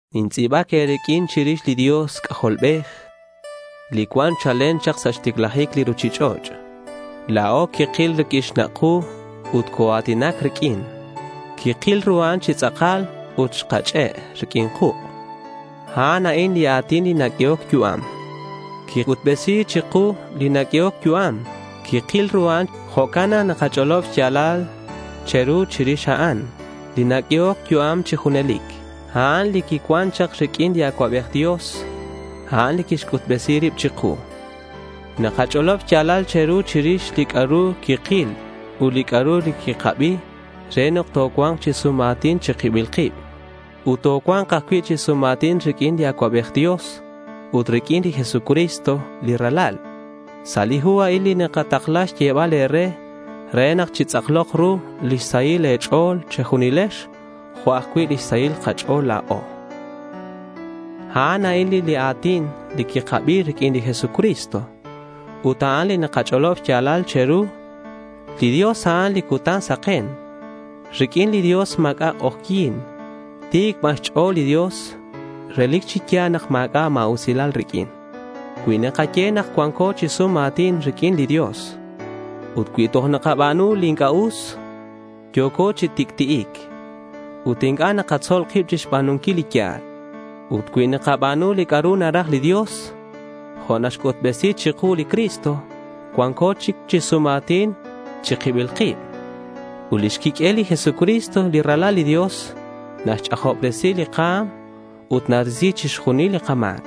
Nintz'i̱bac e̱riq'uin chirix li Dios C'ajolbej li cuan chalen chak sa' xticlajic li ruchich'och'. La̱o quikil riq'uin xnak' ku ut coa̱tinac riq'uin. Quikil ru a'an chi tz'akal ut xkach'e' riq'uin kuk'. A'an a'in li A̱tin naq'uehoc yu'am. Quic'utbesi̱c chiku li naq'uehoc yu'am. Quikil ru a'an. Jo'can nak nakach'olob xya̱lal che̱ru chirix a'an, li naq'uehoc yu'am chi junelic. A'an li cuan chak riq'uin li Acuabej Dios. A'an quixc'utbesi rib chiku. Nakach'olob xya̱lal che̱ru chirix li c'a'ru quikil ut li c'a'ru quikabi re nak tocua̱nk chi sum a̱tin chi kibil kib. Ut tocua̱nk ajcui' chi sum a̱tin riq'uin li Acuabej Dios ut riq'uin li Jesucristo, li Ralal. Sa' li hu a'in nakatakla xyebal e̱re re nak chitz'aklok ru lix sahil e̱ch'o̱l che̱junilex, jo' ajcui' lix sahil kach'o̱l la̱o. A'an a'in li a̱tin quikabi riq'uin li Jesucristo. Ut a'an li nakach'olob xya̱lal che̱ru. Li Dios, a'an li cutan saken. Riq'uin li Dios ma̱c'a' k'ojyi̱n. Ti̱c ban xch'o̱l li Dios. Relic chi ya̱l nak ma̱c'a' ma̱usilal riq'uin. Cui nakaye nak cuanco chi sum a̱tin riq'uin li Dios ut cui toj nakaba̱nu li inc'a' us, yo̱co chi tic'ti'ic. Ut inc'a' nakatzol kib chixba̱nunquil li ya̱l. Ut cui nakaba̱nu li c'a'ru naraj li Dios, jo' naxc'utbesi chiku li Cristo, cuanco chic chi sum a̱tin chi kibil kib. Ut lix quiq'uel li Jesucristo li Ralal li Dios naxch'ajobresi li ka̱m ut narisi chixjunil li kama̱c.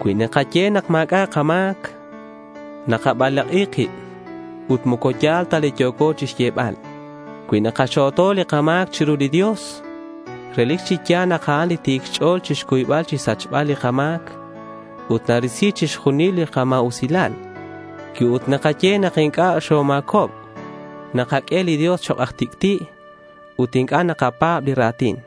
Cui nakaye nak ma̱c'a' kama̱c, nakabalak'i kib ut moco ya̱l ta li yo̱co chixyebal. Cui nakaxo̱to li kama̱c chiru li Dios, relic chi ya̱l nak a'an ti̱c xch'o̱l chixcuybal chixsachbal li kama̱c, ut ta̱risi chixjunil li kama̱usilal. Cui ut nakaye nak inc'a' xoma̱cob nakaq'ue li Dios chok' aj tic'ti'. Ut inc'a' nakapa̱b li ra̱tin.